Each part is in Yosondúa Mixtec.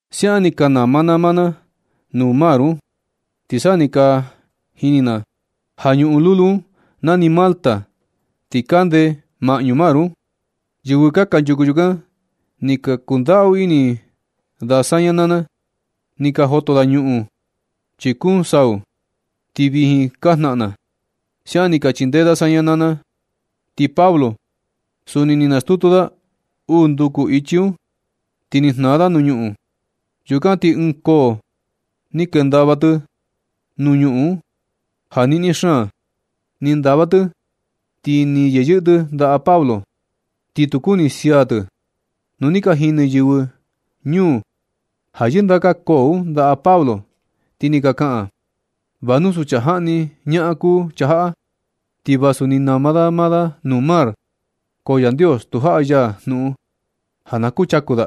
Siaꞌan ni ka nama na maa na nuu mar un, ti sa ni ka jini na ja ñuꞌun lulu un nani Malta, ti kande maꞌñu mar un. Yɨvɨ kanchuku yukan ni ka kundaꞌu ini da saña naa na. Ni ka joto da ñuꞌun, chi kuun sau, ti vijin ka jnaꞌan na. Siaꞌan ni ka chindee da saña naa na. Ti Pablo suni ni nastutu da uu nduku ichi un, ti ni jnaa da nuu ñuꞌun. Yukan ti ɨɨn koo ni kendava tɨ nuu ñuꞌun un ja niꞌni xaan. Ni ndava tɨ ti ni yeyɨꞌɨ tɨ ndaꞌa Pablo, ti tu kuni tɨ sia tɨ. Nu ni ka jini yɨvɨ ñuu un ja yɨndaka koo un ndaꞌa Pablo, ti ni ka kaꞌan: ―Va nu suu chaa jaꞌni ñaꞌan kuu chaa jaꞌa. Ti vasu ni nama da maa da nuu mar, ko Yandios tu jaꞌa ya jnuꞌun ja na kuchaku da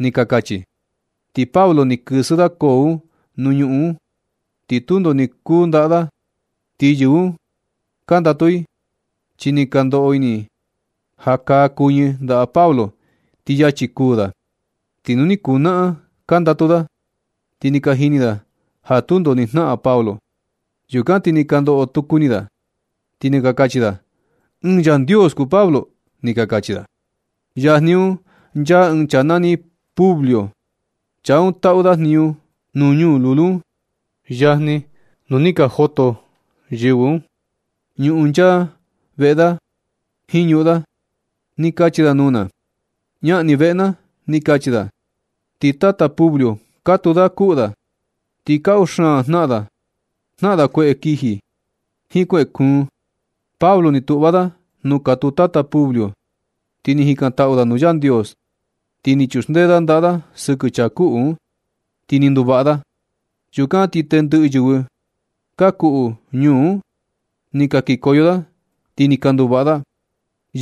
―ni ka kachi i. Ti Pablo ni kɨsɨ da koo un nuu ñuꞌun un, ti tundo ni kuu ndaꞌa da. Ti yɨvɨ un ka ndatu i, chi ni ka ndoꞌo ini i ja kaa kuɨñɨ ndaꞌa Pablo, ti yachi kuū da. Ti ni kuu naꞌan ka ndatu da, ti ni ka jini da ja tundo ni jnaꞌan Pablo. Yukan ti ni ka ndoꞌo tuku ini da, ti ni ka kachi da: ―Ɨɨn yandios kuu Pablo ―ni ka kachi da. Yajni un nchaa ɨɨn chaa nani Publio. Chaa un taꞌu da jniñu nuu ñuu lulu un. Yajni nu ni ka joto yɨvɨ un ñuꞌun nchaa veꞌe da jiin ñuꞌun da. Ni kachi da nuu na: ―Ñaꞌan ni veꞌe na ―ni kachi da. Ti tata Publio, katuu da kuꞌu da, ti kaꞌu xaan jnaꞌan da. Jnaꞌan da kueꞌe kiji, jiin kueꞌe kuun. Pablo ni tuꞌva da nuu katuu tata Publio, ti ni jikantaꞌu da nuu Yandios. Ni chuxndee da ndaꞌa da sɨkɨ chaa kuꞌu un, ti ni nduvaꞌa da. Yukan na ti tendɨꞌɨ yɨvɨ ka kuꞌu ñuu un ni ka kikoyo da, ti ni ka nduvaꞌa da.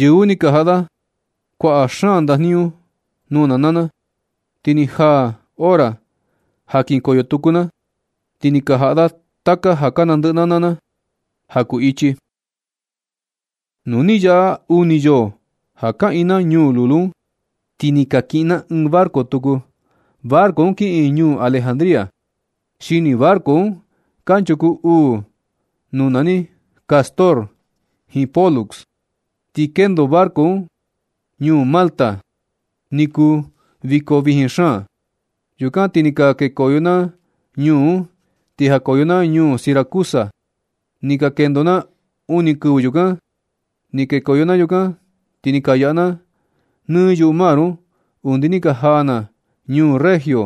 Yɨvɨ un ni ka jaꞌa da kuaꞌa xaan ndajniñu nuu na naa na. Ti ni jaa hora ja kinkoyo tuku na, ti ni ka jaꞌa da taka ja ka nandɨꞌɨ na naa na ja kuu ichi. Nu ni ka yaꞌa uni yoo ja kaꞌiin na ñuu lulu un, ti ni kakiꞌin na ɨɨn barco tuku. Barco un kiꞌin ñuu Alejandría. Xini barco un kanchuku uu nuu nani Cástor jiin Pólux. Ni kendo barco un ñuu Malta ja ni kuu viko vijin xaan. Yukan ti ni ka kekoyo na ñuu un. Ni jakoyo na ñuu Siracusa. Ni ka kendo na uni kɨvɨ yukan. Ni kekoyo na yukan, ti ni ka yaꞌa na nɨ yuꞌu mar un, undi ni ka jaa na ñuu Regio.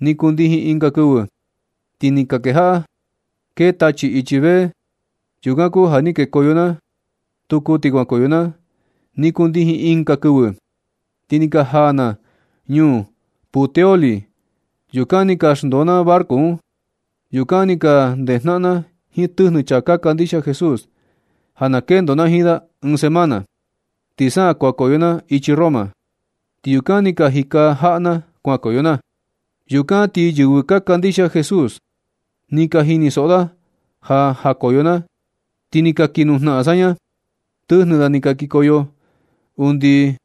Ni kundijin ɨnga kɨvɨ, ti ni kejaꞌa kee tachi ichi vee. Yukan kuu ja ni kekoyo na tuku ti kuankoyo na. Ni kundijin ɨnga kɨvɨ, ti ni ka jaa na ñuu Puteoli. Yukan ti ni ka xndoo na barco un. Yukan ni ka ndejnaꞌan na jiin tɨjnɨ chaa ka kandixia Jesús, ti ni ka kana da saña ja na kendo na jiin da ɨɨn semana. Ti sa kuankoyo na ichi Roma. Ti yukan ni ka jika jaꞌa na kuankoyo na. Yukan ti yɨvɨ ka kandixia Jesús un, ni ka jinisoꞌo da ja jakoyo na, ti ni ka kii nujnaꞌan da saña. Tɨjnɨ da ni ka kikoyo undi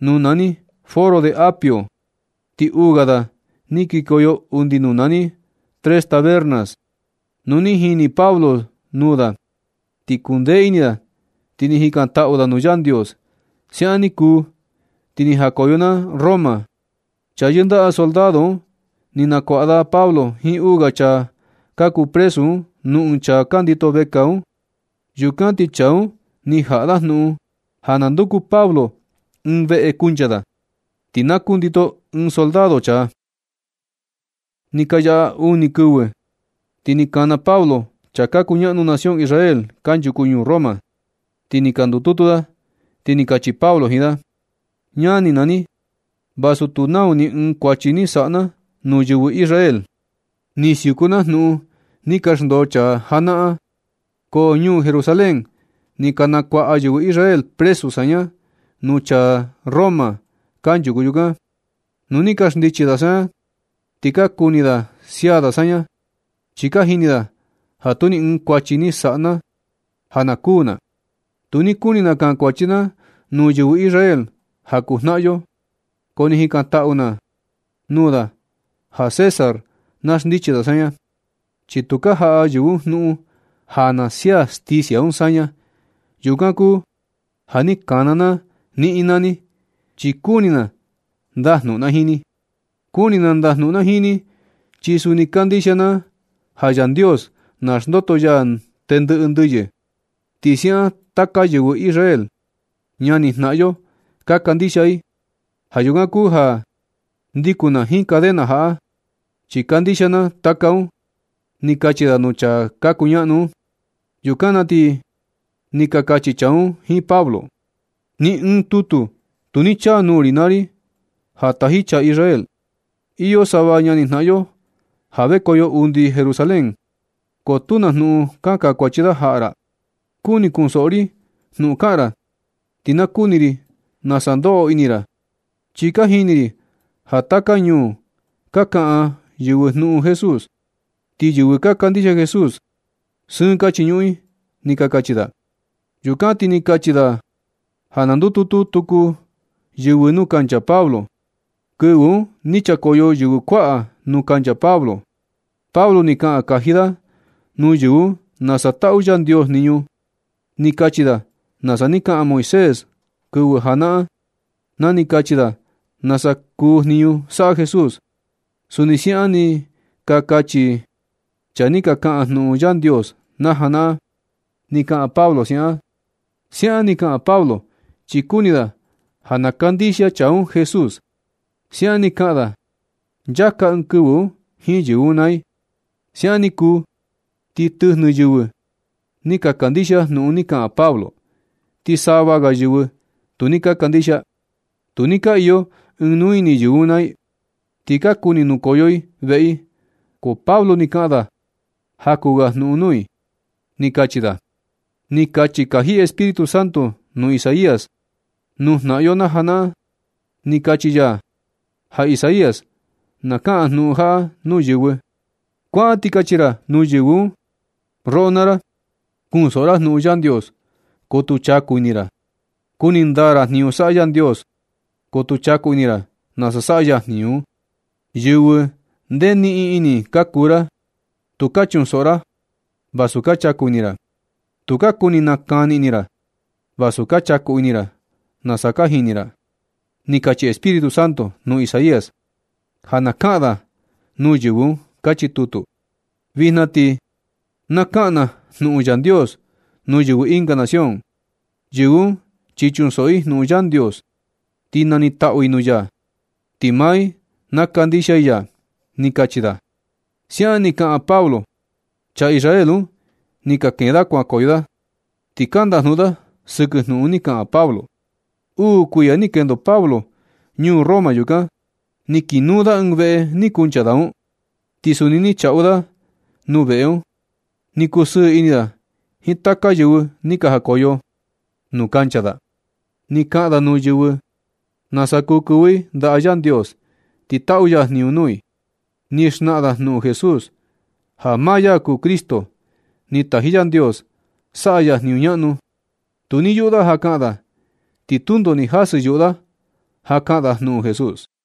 nuu nani Foro de Apio, ti uu ga da ni kikoyo undi nuu nani Tres Tabernas. Nu ni jini Pablo nuu da, ni kundee ini da ti ni jikantaꞌu da nuu Yandios. Siaꞌan ni kuu, ti ni jakoyo na Roma. Chaa yɨndaꞌa soldado un ni nakuaꞌa da Pablo jiin uu ga chaa ka kuu presu un nuu ɨɨn chaa ka ndito vekaa un. Yukan ti chaa un ni jaꞌa da jnuꞌun ja na nduku Pablo ɨɨn veꞌe kuncha da, ti na kundito ɨɨn soldado chaa. Ni ka yaꞌa uni kɨvɨ, ti ni kana Pablo chaa ka kuñaꞌnu nación Israel kanchuku ñuu Roma. Nu ni ka ndututu da, ti ni kachi Pablo jiin da: ―Ñani naa ni, vasu tu nau ni ɨɨn kuachi ni saꞌa na nuu yɨvɨ Israel. Ni siuku na jnuꞌun ni ka xndoo chaa janaꞌan, ko ñuu Jerusalén ni ka nakuaꞌa yɨvɨ Israel presu saña nuu chaa Roma kanchuku yukan. Nu ni ka xndichi da saña, ti ka kuni da sia da saña, chi ka jini da ja tu ni ɨɨn kuachi ni saꞌa na ja na kuū na. Tu ni kuni na kankuachi na nuu yɨvɨ Israel ja kuu jnaꞌan yo, ko ni jikantaꞌu na nuu da ja César na xndichi da saña, chi tu ni ka jaꞌa yɨvɨ un un jnuꞌun ja na sia sticia un saña. Yukan kuu ja ni kana na niꞌin naa ni, chi kuni na ndajnuꞌun na jiin ni. Kuni na ndajnuꞌun na jiin ni, chi suni kandixia na ja Yandios naxndoto ya tendɨꞌɨ ndɨyɨ. Ti siaꞌan taka yɨvɨ Israel, ñanijnaꞌan yo, ka kandixia i. Ja yukan kuu ja ndikun na jiin cadena jaꞌa, chi kandixia na taka un ―ni kachi da nuu chaa ka kuñaꞌnu un. Yukan na ti ni ka kachi chaa un jiin Pablo: ―Ni ɨɨn tutu tu ni chaa nuu ri naa ri ja taji chaa Israel. Iyo sava ñanijnaꞌan yo ja vekoyo undi Jerusalén, ko tu na jnuꞌun ka kankuachi da jaꞌa ra. Kuni kunsoꞌo ri jnuꞌun kaꞌan ra, ti na kuni ri nasa ndoꞌo ini ra, chi ka jini ri ja taka ñuu ka kaꞌan yɨvɨ jnuꞌun Jesús, ti yɨvɨ ka kandixia Jesús, sɨɨn ka chiñuꞌun i ―ni ka kachi da. Yukan ti ni ka kachi da ja na ndututu tuku yɨvɨ nuu kancha Pablo. Kɨvɨ un ni chakoyo yɨvɨ kuaꞌa nuu kancha Pablo. Pablo ni kaꞌan kaji da nuu yɨvɨ un nasa taꞌu Yandios jniñu. Ni kachi da nasa ni kaꞌan Moisés kɨvɨ janaꞌan, na ni kachi da nasa kuu jniñu saꞌa Jesús. Suni siaꞌan ni ka kachi chaa ni ka kaꞌan jnuꞌun Yandios najanaꞌan, ni kaꞌan Pablo. Siaꞌan ni kaꞌan Pablo, chi kuni da ja na kandixia chaa un Jesús. Siaꞌan ni kaꞌan da nchaka ɨɨn kɨvɨ un jiin yɨvɨ un naa i. Siaꞌan ni kuu ti tɨjnɨ yɨvɨ ni ka kandixia jnuꞌun ni kaꞌan Pablo, ti sava ga yɨvɨ tu ni ka kandixia. Tu ni ka iyo ɨɨn nuu ini yɨvɨ un naa i, ti ka kuni nokoyo i veꞌe i, ko Pablo ni kaꞌan da jaku ga jnuꞌun nuu i. Ni kachi da: ―Ni kachi kaji Espíritu Santo nuu Isaías nuu jnaꞌan yo janaꞌan. Ni kachi ya ja Isaías na kaꞌan jnuꞌun jaꞌa nuu yɨvɨ: Kuaꞌan ti kachi ra nuu yɨvɨ un: Roꞌo naa ra, kunsoꞌo ra jnuꞌun Yandios, ko tu chaku ini ra. Kuni ndaa ra jniñu saꞌa Yandios, ko tu chaku ini ra nasa saꞌa ya jniñu un. Yɨvɨ ndee niꞌin ini ka kuu ra. Tukaa chunsoꞌo ra, vasu ka chaku ini ra. Tu ka kuni nakani ini ra, vasu ka chaku ini ra nasa ka jini ra, ni kachi Espíritu Santo nuu Isaías, ja na kaꞌan da nuu yɨvɨ un. Kachi tutu. Vijna ti na kaꞌan na jnuꞌun Yandios nuu yɨvɨ ɨnga nación. Yɨvɨ un chi kunsoꞌo i jnuꞌun Yandios, ti nanitaꞌu i nuu ya, ti maa i na kandixia i ya ―ni kachi da. Siaꞌan ni kaꞌan Pablo. Chaa Israel un ni ka kee da kuankoyo da, ti ka ndajnuꞌun da sɨkɨ jnuꞌun ni kaꞌan Pablo. Uu kuiya ni kendo Pablo ñuu Roma yukan. Ni kiꞌin nuu da ɨɨn veꞌe ni kuncha da un, ti suni ni chaꞌu da nuu veꞌe un. Ni kusɨɨ ini da jiin taka yɨvɨ ni ka jakoyo nuu kancha da. Ni kaꞌan da nuu yɨvɨ un nasa kuu kɨvɨ i ndaꞌa Yandios ti taꞌu ya jniñu nuu i. Ni xnaꞌan da jnuꞌun Jesús, ja maa ya kuu Cristo ni taji Yandios saꞌa ya jniñu ñaꞌnu. Tu ni yuꞌu da ja kaꞌan da, ti tundo ni jasɨ yuꞌu da ja kaꞌan da jnuꞌun Jesús.